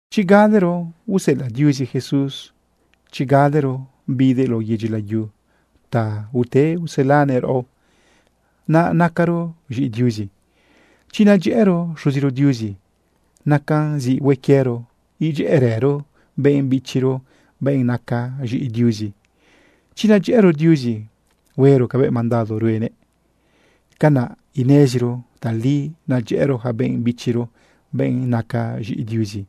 Chi galero useꞌelaꞌ Diuzi Jesús, chi galero bidëꞌ lao yedyi layu ta ute uselanëꞌ raꞌo, naꞌ nacaro z̃iꞌi Diuzi. Chi nadyëꞌëro Xuziro Diuzi, nacan zi hue quiero idyëꞌërëro benꞌ bichiro, benꞌ naca z̃iꞌi Diuzi. Chi nadyëꞌëro Diuzi huero cabëꞌ mandado ruenëꞌ, canaꞌ ineziro tali naꞌ nadyëꞌëro yaca benꞌ bichiro, benꞌ naca z̃iꞌi Diuzi.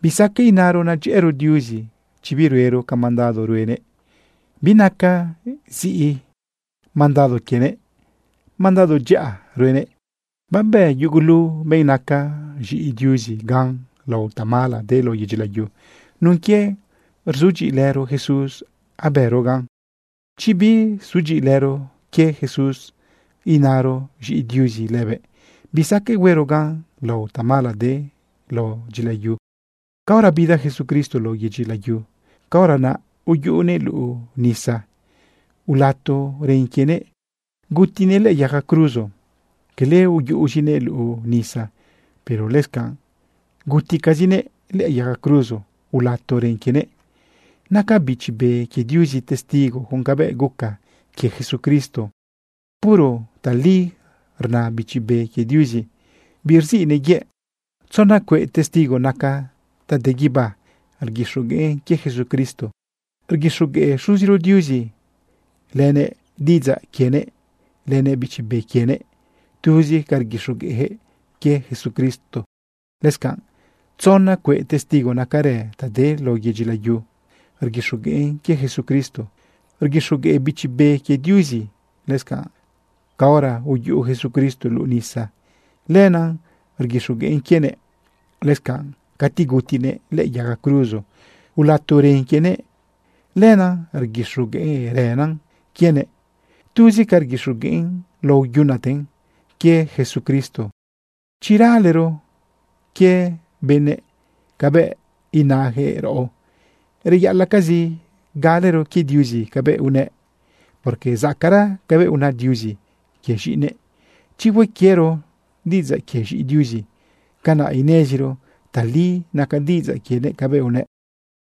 Bisaqueꞌ inaro nadyëꞌëro Diuzi chi biruero ca mandado ruenëꞌ. Binaca ziꞌi mandado quienëꞌ. Mandado dyaꞌa ruenëꞌ. Babë yugulu benꞌ naca z̃iꞌi Diuzi gan lao tamala de lao yedyi layu. Nun quie rzudyiꞌilëro Jesús abëro gan. Chi bisudyiꞌilëro quie Jesús inaro z̃iꞌi Diuzi lëbëꞌ, bisaqueꞌ huero gan lao tamala de lao dyila yu. Caora bida Jesucristo lao yedyi layu, caora naꞌ uyuꞌunëꞌ luꞌu nisa, ulato ren quienëꞌ gutinëꞌ lëꞌë yaga cruzo. Quele uyuꞌuzinëꞌ luꞌu nisa, pero lëscanꞌ guticazinëꞌ lëꞌë yaga cruzo ulato ren quienëꞌ. Naca Bichi Be quie Diuzi testigo con cabëꞌ guca quie Jesucristo. Puro tali rna Bichi Be quie Diuzi, birziꞌnëꞌ yëꞌ. Tzona cueꞌ testigo naca ta de guibá rguixogueꞌn quie Jesucristo. Rguixogueꞌ Xuziro Diuzi, lënëꞌ diꞌidzaꞌ quienëꞌ, lënëꞌ Bichi Be quienëꞌ. Tuzi ca rguixogueꞌjëꞌ quie Jesucristo. Lëscanꞌ tzona cueꞌ testigo nacarë ta de lao yedyi layu rguixogueꞌn quie Jesucristo. Rguixogueꞌ Bichi Be quie Diuzi. Lëscanꞌ caora uyuꞌu Jesucristo luꞌu nisa, lenaꞌ rguixogueꞌn quienëꞌ. Lëscanꞌ cati gutinëꞌ lëꞌë yaga cruzo, ulato ren quienëꞌ, lenaꞌ rguixogueꞌrënan quienëꞌ. Tuzi ca rguixogueꞌn lao yunaten quie Jesucristo. Chi ralero quie benëꞌ cabëꞌ inajëꞌ raꞌo, reyaꞌalaꞌcazi galero quie Diuzi cabëꞌ unëꞌ, porque zacaꞌra cabëꞌ una Diuzi quie z̃iꞌinëꞌ. Chi hue quiero diꞌidzaꞌ quie z̃iꞌi Diuzi, canaꞌ ineziro tali nacan diꞌidzaꞌ quienëꞌ cabëꞌ unëꞌ.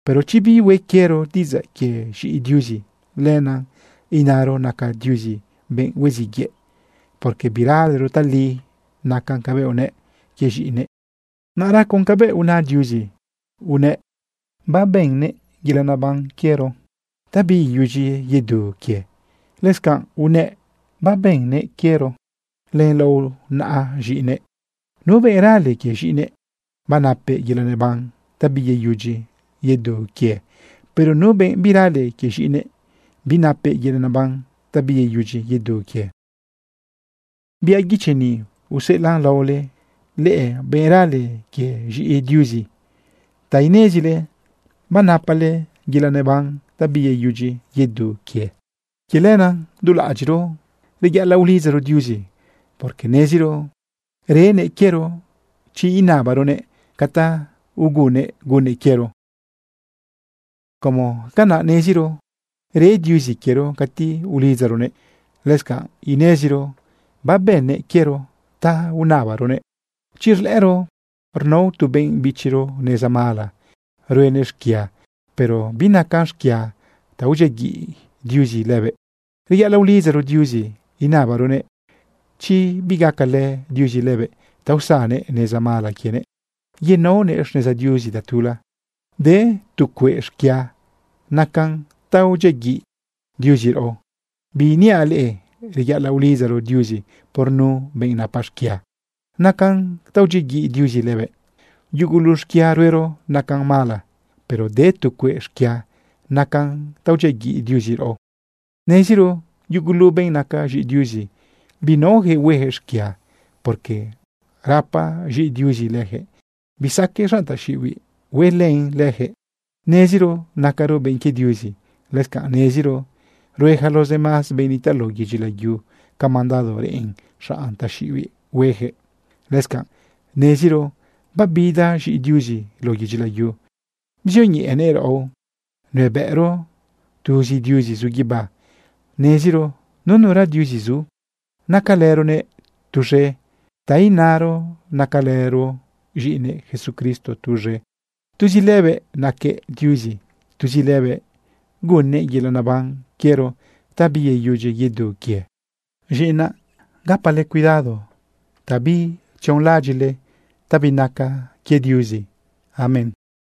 Pero chi bihue quiero diꞌidzaꞌ quie z̃iꞌi Diuzi, lenaꞌ inaro naca Diuzi benꞌ huiziꞌ yëꞌ, porque biralero tali nacan cabëꞌ unëꞌ quie z̃iꞌinëꞌ. Naꞌra con cabëꞌ una Diuzi, unëꞌ babënnëꞌ yelaꞌ neban quiero ta biyeyudyi yedu quië. Lëscanꞌ unëꞌ babënnëꞌ quiero len lao naꞌa z̃iꞌinëꞌ. Nu benꞌ rale quie z̃iꞌinëꞌ, banapëꞌ yelaꞌ neban ta biyeyudyi yedu quie. Pero nu benꞌ birale quie z̃iꞌinëꞌ, binapëꞌ yelaꞌ naban ta biyeyudyi yedu quie. Biaꞌ guichi ni useꞌelaꞌn laole leꞌe, benꞌ rale quie z̃iꞌi Diuzi, ta inezile banapale yelaꞌ neban ta biyeyudyi yedu quie. Quie lenaꞌ du laꞌadyiꞌro reyaꞌalaꞌ ulidzaro Diuzi, porque neziro renëꞌ quiero chi inabaronëꞌ ca ta ugunnëꞌ gunnëꞌ quiero. Como canaꞌ neziro re Diuzi quiero cati ulidzaronëꞌ, lëscanꞌ ineziro babënnëꞌ quiero ta unabaronëꞌ. Chi rlëꞌëro rnao tu benꞌ bichiro neza mala ruenëꞌ xquia, pero binacan xquia ta udyiaguiꞌ Diuzi lëbëꞌ, reyaꞌalaꞌ ulidzaro Diuzi inabaronëꞌ chi bigacalë Diuzi lëbëꞌ ta usannëꞌ neza mala quienëꞌ yenaonëꞌ xneza Diuzi tatula. De tu cueꞌ xquia nacan ta udyiaguiꞌ Diuzi raꞌo. Biiniaꞌ leꞌe reyaꞌalaꞌ ulidzaro Diuzi por nu benꞌ napa xquia nacan ta udyiaguiꞌ Diuzi lëbëꞌ. Yugulu xquia ruero nacan mala, pero de tu cueꞌ xquia nacan ta udyiaguiꞌ Diuzi raꞌo. Neziro yugulu benꞌ naca z̃iꞌi Diuzi binaojëꞌ huejëꞌ xquia, porque rapa z̃iꞌi Diuzi lëjëꞌ. Bisaqueꞌ xanꞌ taxiꞌibiꞌ huelën lëjëꞌ. Neziro nacaro benꞌ quie Diuzi. Lëscanꞌ neziro rue yaca los demás benꞌ nitaꞌ lao yedyi layu ca mandado reꞌen xanꞌ taxiꞌibiꞌ huejëꞌ. Lëscanꞌ neziro babida z̃iꞌi Diuzi lao yedyi layu bzioñeꞌenëꞌ raꞌo nuebëꞌro tuzi Diuzi zu guibá, neziro nunura Diuzi zu. Nacalëronëꞌ tuz̃e, ta inaro, nacalëro z̃iꞌinëꞌ Jesucristo tuz̃e. Tuzi lëbëꞌ naquëꞌ Diuzi, tuzi lëbëꞌ gunnëꞌ yelaꞌ naban quiero ta biyeyudyi yedu quie. Z̃iꞌinaꞌ, gapale cuidado ta birionlaꞌadyiꞌle ta binaca Diuzi. Amén.